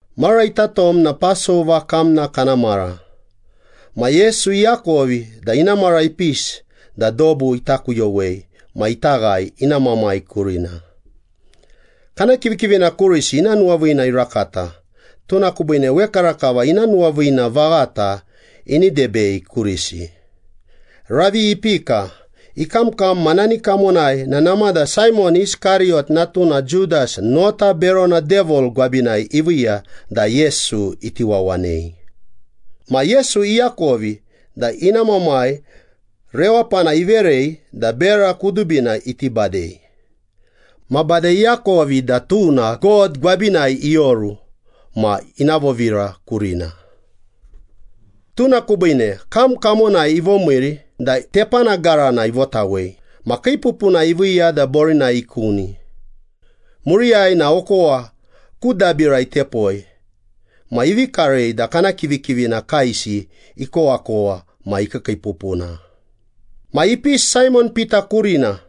Mara ita tom na Pasova kamna kana mara, ma Yesu iakovi da ina mara ipisi da dobu ita kuyowei ma ita ghae ina Mamai kurina. Kana kivikivina kurisi ina nuwaviina irakata, tuna kubiine wekarakava ina nuwaviina vaghata ini debei kurisi. Ravi ipika, ikamkam ma nani kamonai na namada Saimon Iskariyot natuna Judas nota berona Devil gwabinai iviiya da Yesu iti wawanei. Ma Yesu iakovi da ina Mamai rewapana iverei da bera kudubina iti badei. Ma bade iakovi da tuna God gwabinai ioru ma ina vovira kurina. Tuna kubiine kam kamonai ivomiiri da tepana garana ivotawei ma kiipupuna iviiya da borinai ikuni. Muriyai na okowa ku dabira itepoi ma ivi karei da kana kivikivina kaesi ikowakowa ma ikiikiipupuna. Ma ipisi Saimon Pita kurina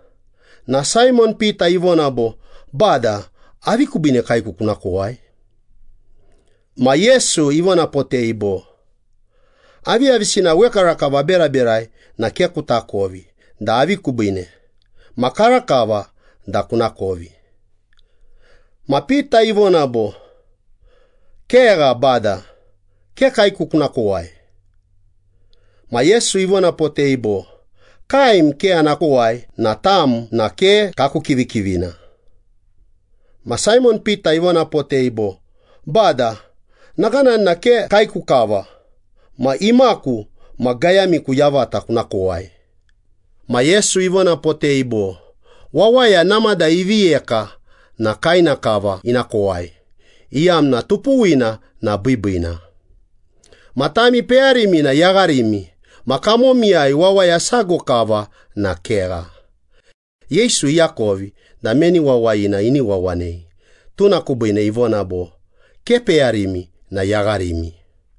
na Saimon Pita ivona bo, “Bada, avi kubiine kaeku kuna kowai?” Ma Yesu ivonapotei bo, “Aviyavisina wekarakava aberaberai na ke kutakovi da avi kubiine. Ma karakava da kunakovi.” Ma Pita ivona bo, “Kegha Bada, ke kaeku kuna kowai.” Ma Yesu ivonapotei bo, “Kaem ke ana kowai na tam na ke kaku kivikivina.” Ma Saimon Pita ivonapotei bo, “Bada, nakanani na ke kaeku kava ma imaku ma gayamiku yavata kuna kowai.” Ma Yesu ivonapotei bo, “Wawaya namada ivi yeka na kaena kava ina kowai, iyamna tupuwina na biibiina. Ma tami peyarimi na yagharimi ma kamomiyai wawaya sago kava na kegha.” Yesu iakovi da meni wawayina ini wawanei, tuna kubiine ivona bo, “Ke peyarimi na yagharimi.”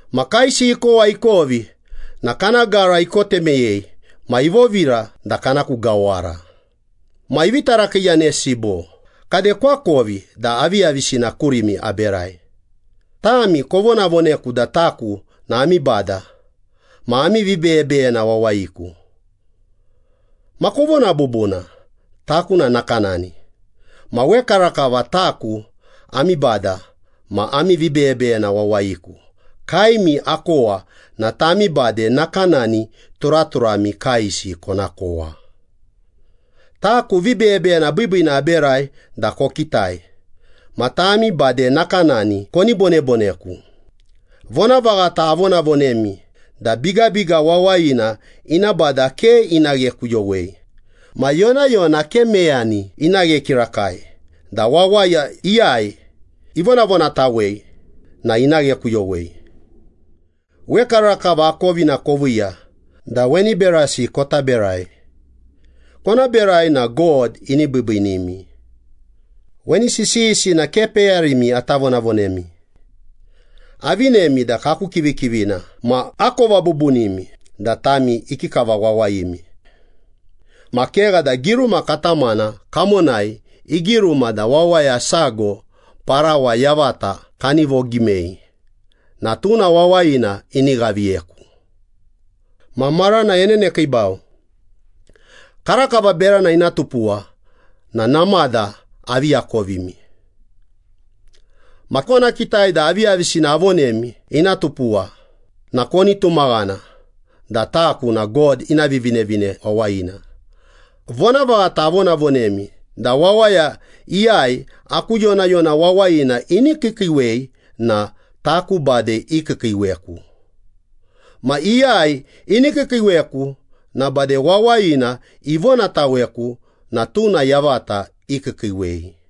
Ma kaesi ikowa ikovi na kana gara ikote meyei, ma ivovira da kana ku gawara. Ma ivi tarakiiyanesi bo, “Kade koakovi da aviyavisina kurimi aberai? Tami kovonavoneku da taku na ami Bada ma ami vibeyebeyena wawayiku. Ma kovona bubuna, taku na nakanani. Ma wekarakava taku ami Bada ma ami vibeyebeyena wawayiku kaemi akowa na tami bade nakanani turaturami kaesi kona kowa. Taku vibeyebeyena biibiina aberai da kokitai. Ma tami bade nakanani koni boneboneku. Vonavaghata avonavonemi da bigabiga wawayina ina bada ke ina ghekuyowei. Ma yonayona ke meyani ina ghe kirakai da wawaya iyai ivonavonatawei na ina ghekuyowei. Wekarakava akovina koviiya da weni berasi kota berai. Kona berai na God ini biibiinimi.” “Weni sisiyisi na ke peyarimi ata vonavonemi. Avinemi da kaku kivikivina ma akova bubunimi da tami ikikava wawayimi. Ma kegha da giruma katamana kamonai igiruma da wawaya sago parawa yavata kani vogimei na tuna wawayina ini ghaviyeku. Ma marana enenekiibau. Karakava berana ina tupuwa na namada avi akovimi. Ma kona kitai da aviyavisina avonemi ina tupuwa na koni tumaghana da taku na God ina Vivinevine Wawayina. Vonavaghata avonavonemi da wawaya iyai aku yonayona wawayina ini kiikiiwei na taku bade ikiikiiweku. Ma iyai ini kiikiiweku na bade wawayina ivonataweku na tuna yavata ikiikiiwei.”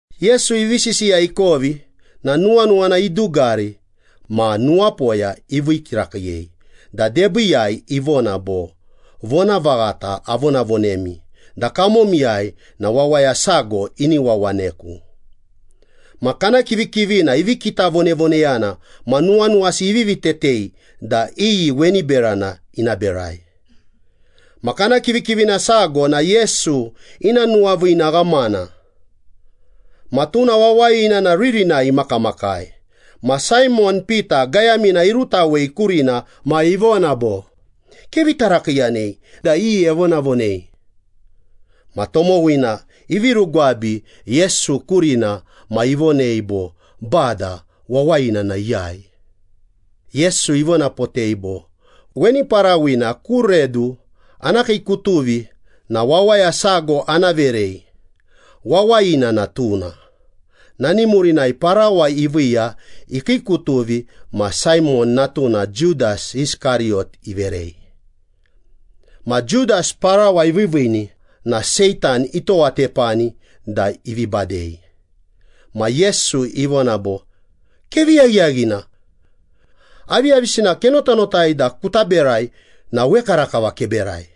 Yesu ivi sisiya ikovi na nuwanuwana idugari ma nuwapoya ivii kirakiiyei da debiiyai ivona bo, “Vonavaghata avonavonemi da kamomiyai na wawaya sago ini wawaneku.” Ma kana kivikivina ivi kitavonevoneyana ma nuwanuwasi ivivi tetei da iyi weni berana ina berai. Ma kana kivikivina sago na Yesu ina nuwaviina ghamana. Ma tuna wawayina na ririnai imakamakai, ma Saimon Pita gayamina irutawei kurina ma ivona bo, “Kevi tarakiiyanei da iyi evonavonei.” Ma tomowina ivi rugwabi Yesu kurina ma ivonei bo, “Bada, wawayina na iyai?” Yesu ivonapotei bo, “Weni parawina ku redu ana kiikutuvi na wawaya sago ana verei. Wawayina na tuna.” Nani murinai parawa iviiya ikiikutuvi ma Saimon natuna Judas Iskariyot iverei. Ma Judas parawa iviiviini na Seitan itowatepani da ivi badei. Ma Yesu ivona bo, “Kevi yaghiyaghina. Aviyavisina kenotanotai da kuta berai na wekarakava keberai.”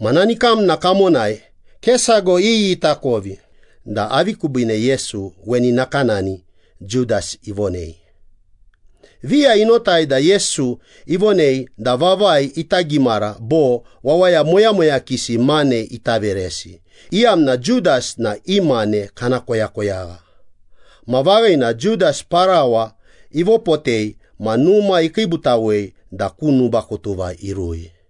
Ma nani kamna kamonai ke sago iyi itakovi da avi kubiine Yesu weni nakanani Judas ivonei. Viya inotai da Yesu ivonei da vavai ita gimara bo wawaya moyamoyakisi mane ita veresi, iyamna Judas na i mane kana koyakoyagha. Ma vaghina Judas parawa ivopotei ma numa ikiibutawei da ku nubakutuva irui.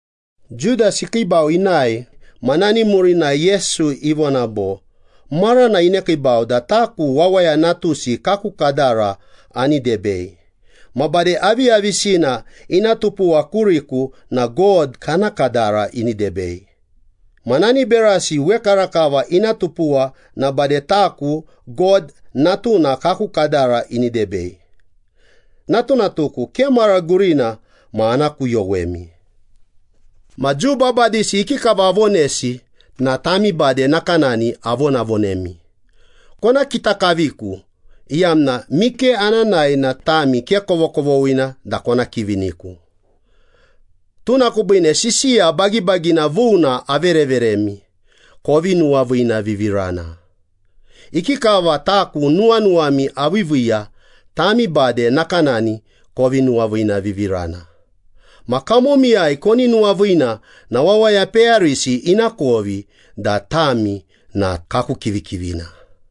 Judas ikiibau inae ma nani murinai Yesu ivona bo, “Marana inekiibau da taku Wawaya Natusi kaku kadara ani debei. Ma bade aviyavisina ina tupuwa kuriku na God kana kadara ini debei. Ma nani berasi wekarakava ina tupuwa na bade taku God Natuna kaku kadara ini debei. Natunatuku, ke mara gurina ma ana kuyowemi. Ma Jiu babadisi ikikava avonesi na tami bade nakanani avonavonemi. Kona kita kaviku iyamna mike ana nae na tami ke kovokovoghina da kona kiviniku. Tuna kubiine sisiya bagibagina vuna avereveremi. Kovi nuwaviinavivirana. Ikikava taku nuwanuwami aviiviiya, tami bade nakanani kovi nuwaviinavivirana. Ma kamomiyai koni nuwaviina na wawaya peyarisi inakovi da tami na kaku kivikivina.”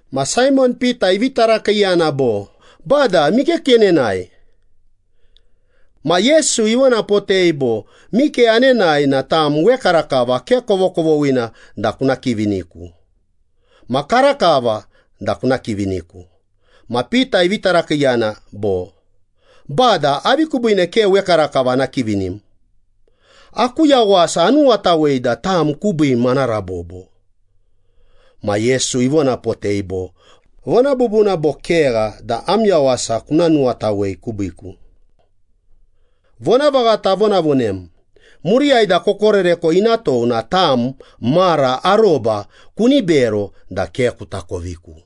Ma Saimon Pita ivi tarakiiyana bo, “Bada, mike kenenae?” Ma Yesu ivonapotei bo, “Mike anenae na tam wekarakava ke kovokovoghina da kuna kiviniku. Ma karakava da kuna kiviniku.” Ma Pita ivi tarakiiyana bo, “Bada, avi kubiine ke wekarakava ana kivinim? Aku yawasa anuwatawei da tam kubiim ana rabobo.” Ma Yesu ivonapotei bo, “Vona bubuna bo kegha da am yawasa kuna nuwatawei kubiiku? Vonavaghata avonavonem, muriyai da kokoreko ina tou na tam mara aroba kuni bero da ke kutakoviku.”